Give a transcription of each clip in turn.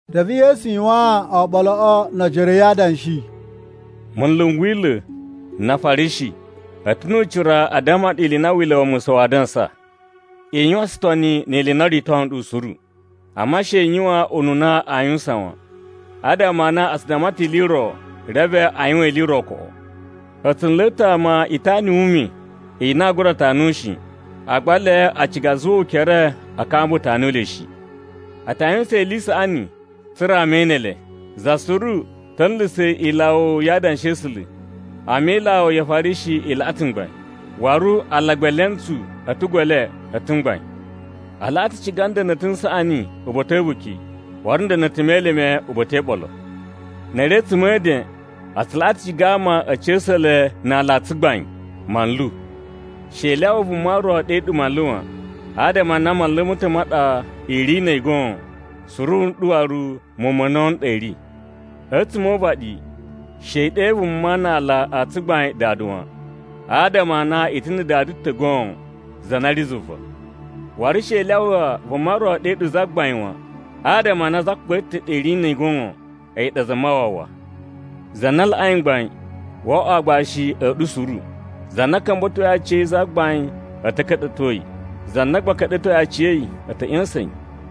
Reve Yesu yuwaan oɓoloꞌo no ojoro a̱ yi adanshi, “Munlu n Wila̱ na Afarishi a̱ ta̱ nu ucira a damma ɗu ili i na Wila̱ wa Musa waa dansa. I yuwan tsutoni ni ili i na o rito nɗu suru, amma she i yuwan ununa aa yuwusan wan. Adama a na a tsu damma ta̱ ili i ro, reve a yuwan ili i ro koꞌo. A̱ tsu nla̱a̱ ta̱ ama itana yu ume i na aa gura tanu shi, agba ele a ciga a zuwa ukere a kamba tanu le shi. “A ta yuwusan ili i saꞌani tsa̱ra̱ ama e ene le, za suru ta̱ nla̱sa̱ ilawo ya Adanshi a̱ A̱sula̱, amma ilawo ya Afarishi i laꞌa ta̱ mgbain. Waru alagba e elentsu a̱ a̱tugu e le a̱ ta̱ mgbain. A laꞌa ta ciga nda̱na̱ta̱ n saꞌani uba̱ta̱ a̱ a̱buki, waru na̱ nda̱na̱ta̱ me elime uba̱ta̱ e iɓolo. Na̱ a̱ ri a̱tsuma̱ e eden, a tsu laꞌa ta̱ ciga ama a̱ ca̱sa̱ le na aala a tsugbain, ‘Manlu.’ “She i lyawa vuma ro ɗe ɗu ‘Manlu’ wan, adama a na Manlu ma̱ ta̱ ma ɗa i ri na̱ a̱yi goon, suru nɗu waru muwun ma̱ a̱na̱wu n ɗa i ri. A̱tsuma̱ o uvaɗi she i ɗe vuma na aala a tsugbain ‘Dada’ wan, adama a na i ta̱ na̱ Dada ta̱ goon, za na ri zuva. Waru she i lyawa vuma ro ɗe ɗu ‘Zagbain’ wan, adama a na Zagbain ta̱ ɗa i ri na̱ a̱yi goon, a̱yi ɗa Zamawawa. Za na laꞌai mgbain, wo oꞌwo aagbashi a̱ ɗu suru. Za na ka̱mba̱toi aciya̱yi zagbain a̱ ta̱ ka̱ɗa̱to yi, za na gba ka̱ɗa̱toi aciya̱yi a̱ ta̱ ꞌya̱sa̱n yi.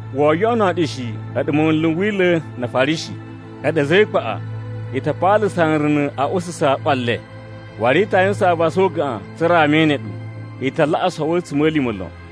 Woo yoꞌono ɗu shi a̱ɗu munlu n Wila̱ na Afarishi. A̱ɗu a̱za̱ e ikpaꞌa! I ta paalasa nruna̱ a ususa ꞌwa le, waru i ta yuwusan avasa o ugaꞌan tsa̱ra̱ ama e ene ɗu. I ta laꞌa sowo a̱tsuma̱lima̱ lon.]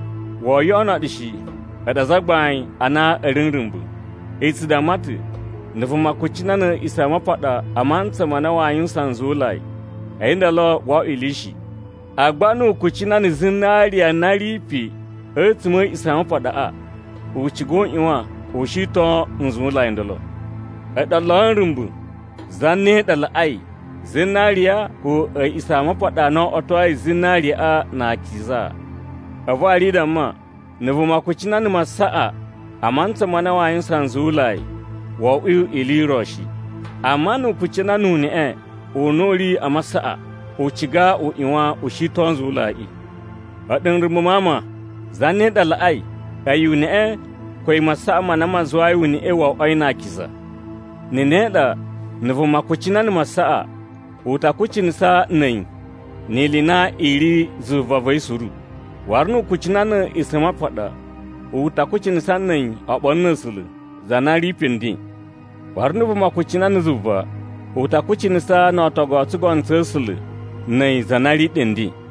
“Woo yoꞌono ɗu shi, a̱ɗu azagbain a na ri nrumba̱! I tsu damma ta̱, ‘Na̱ vuma kucina na̱ A̱a̱ꞌisamapaɗa a mantsa ma na waa yuwusan nzuwulai, a̱yi ndolo wo oꞌwo ili shi. Agba nu u kucina na̱ zinariya na ri pe a̱tsuma̱ a̱ A̱a̱ꞌisamapaɗaꞌa, u ciga u ꞌyuwan u shiton nzuwulai ndolo.’ A̱ɗu olo a̱ nrumba̱! Zane ɗa laꞌai: zinariya ko A̱a̱ꞌisamapaɗa a na o oꞌwotoi zinariyaꞌa na akiza? A̱vu waru i damma, ‘Na̱ vuma kucina na̱ masaꞌa a mantsa ma na waa yuwusan nzuwulai, wo oꞌwo ili i ro shi. Amma nu u kucina nu uneꞌe u na u ri a masaꞌa, u ciga u ꞌyuwan u shiton nzuwulaiꞌi.’ A̱ɗu nrumba̱ ma ama! Zane ɗa laꞌai: a̱yi uneꞌe ko a̱yi masaꞌa ma na ma zuwai uneꞌe wo oꞌwoi na akiza? Na̱ ne ɗa, na̱ vuma kucina na̱ masaꞌa, u ta kucinasa na̱ a̱yi ni ili i na i ri zuva va̱ yi suru. Waru nu u kucina na̱ A̱a̱ꞌisamapaɗa, u ta kucinasa na̱ a̱yi oɓolo na̱ A̱sula̱, za na ri pe nden. Waru na̱ vuma kucina na̱ zuva, u ta kucinasa no ootogu o tsugono tsa̱ A̱sula̱ na̱ a̱yi za na ri ɗe nden.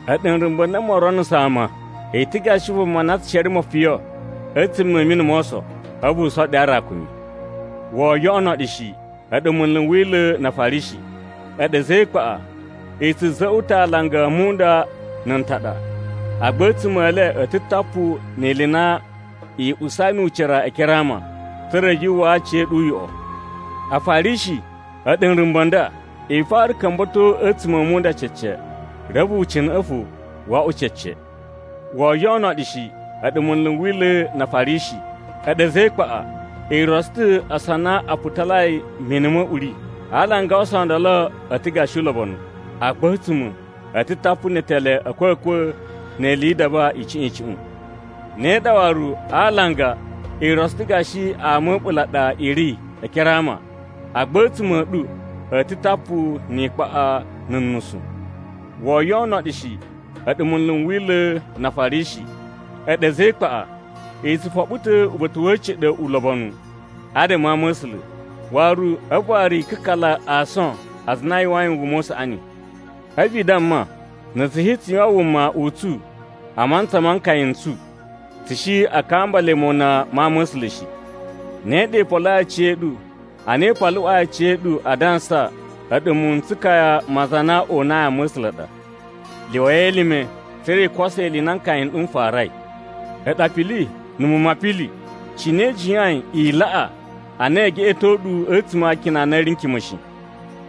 A̱ɗu nrumba̱ n na moo ronuso ama! I ta̱ gashi vuma na tsu shere mofiyon a̱tsuma̱ a̱ mini mo oso, a̱vu u soɗu aarakumi! “Woo yoꞌono ɗu shi, a̱ɗu munlu n Wila̱ na Afarishi. A̱ɗu a̱za̱ e ikpaꞌa! I tsu za̱za̱ꞌwa̱ ta̱ alanga a munda na̱ ntaɗa, agba a̱tsuma̱ e le a̱ ta̱ tapu ni ili i na i usai nu ucira e ekere a ama, tsa̱ra̱ yu uwwaa aciya̱ɗu uyoꞌo. Afarishi, a̱ɗu nrumba̱ n ɗa! I fara ka̱mba̱to a̱tsuma̱ a munda cece, reve ucina̱ꞌa̱ fo wo oꞌwo cece! “Woo yoꞌono ɗu shi, a̱ɗu munlu n Wila̱ na Afarishi. A̱ɗu a̱za̱ e ikpaꞌa! I rotso ta̱ ason a na a putalai mini ma̱ uꞌuri. Alanga a ason o ndolo a̱ ta̱ gashi ulobonu, agba a̱tsuma̱, a̱ ta̱ tapu ne etele a̱ a̱kwa̱kwa̱ ni ili yi idaba icuꞌun icuꞌun. Ne ɗa waru, a alanga i rotso ta̱ gashi ama a̱ a̱ɓula̱ a ɗa i ri e ekere a ama, agba a̱tsuma̱ a̱ ɗu a̱ ta̱ tapu ni ikpaꞌa na̱ nusu. “Woo yoꞌono ɗu shi, a̱ɗu munlu n Wila̱ na Afarishi. A̱ɗu a̱za̱ e ikpaꞌa! I tsu foɓo ta̱ uba̱ta̱ wa̱ a̱ciɗa̱ ulobonu adama a ama̱sula̱, a̱vu waru i kakala ason a aza a na a yuwain wuma u saꞌani. A̱vu i damma, ‘Na̱ tsu shi tsu yuwan wuma u tsu a mantsa ma nkaya n tsu, tsu shi a kamba le mona ma ama̱sula̱ shi.’ Ne ɗa i poloi aciya̱ɗu a na i paluꞌwai aciya̱ɗu adansa a̱ɗu muwun n tsukaya ma aza a na o unai ama̱sula̱ a ɗa! Lyuwai elime tsa̱ra̱ i koso ili i na nkaya n ɗu n farai! “A̱ɗu apili na̱ muwun ma apili! Cine i jiyain i laꞌa a na ee geꞌeto ɗu a̱tsuma̱ a akina a na a̱ ri n kima̱ shi?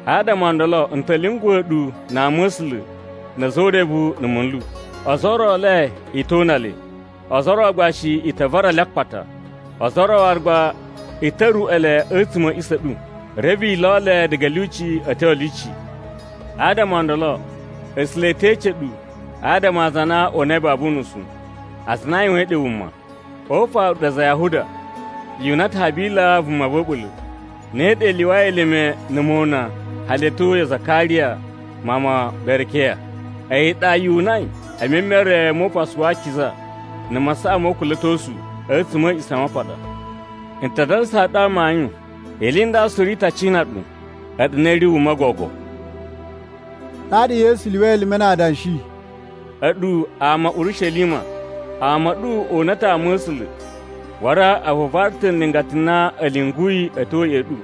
Adama o ndolo n ta̱ lyunguwa̱ ɗu na ama̱sula̱ na̱ a̱za̱ o urevu na̱ munlu. Ozo o ro e le i to una le, ozo o ro gba shi i ta vara le a akpata. Ozo o ro waru gba i ta ruruꞌwa̱ le a̱tsuma̱ a̱ a̱ꞌisa̱ a̱ ɗu, reve i lo le diga a̱ lyuci a̱ tyo a̱ lyuci. Adama o ndolo, A̱sula̱ e te ece ɗu adama a aza a na o unai babu unusu, aza a na a yuwain ɗe wuma. O ufaru a̱ɗu aza a Yahuda, yu una ta̱ Habila vuma va̱ a̱ɓula̱, ne ɗa i lyuwai elime na̱ mona hali a̱ tyo ya Zakariya mawun ma Berekiya. A̱yi ɗa yu unai e memere mo Upasu wa Akiza na̱ masaꞌa mo ukula̱tosu a̱tsuma̱ a̱ A̱a̱ꞌisamapaɗa. N ta dansaa ɗu amayun, ili i nda suru i ta cina ɗu, a̱ɗu na i ri wuma gogo.” Ɗaɗa Yesu lyuwai elime na adanshi, “A̱ɗu ama a̱ Urishelima! Ama a̱ ɗu o una ta̱ ama̱sula̱ waru a vuvara ta̱ nlingata n na a̱ lyunguyi a̱ tyo ya̱ꞌa̱ ɗu.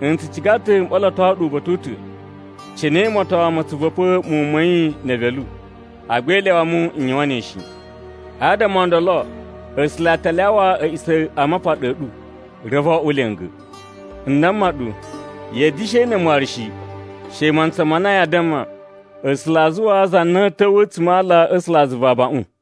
N tsu ciga ta̱ m ɓoloto ɗu uba̱ta̱ u ta̱, cine moton mo tsu va̱pa̱ muwun ma̱ yi ne evelu. Agba i lyawa mu n yuwan ne shi. Adama o ndolo A̱sula̱ a ta lyawa A̱a̱ꞌisamapaɗa a̱ ɗu, reve wo oꞌwo lya̱nga̱. N damma ɗu, ya̱a̱ da̱shi ene mu waru shi, she mantsa ma na yaa damma, ‘A̱sula̱ a zuwaa za na a̱a̱ ta̱wa̱ a̱tsuma̱ a ala a̱ A̱sulazuva abaꞌun.’”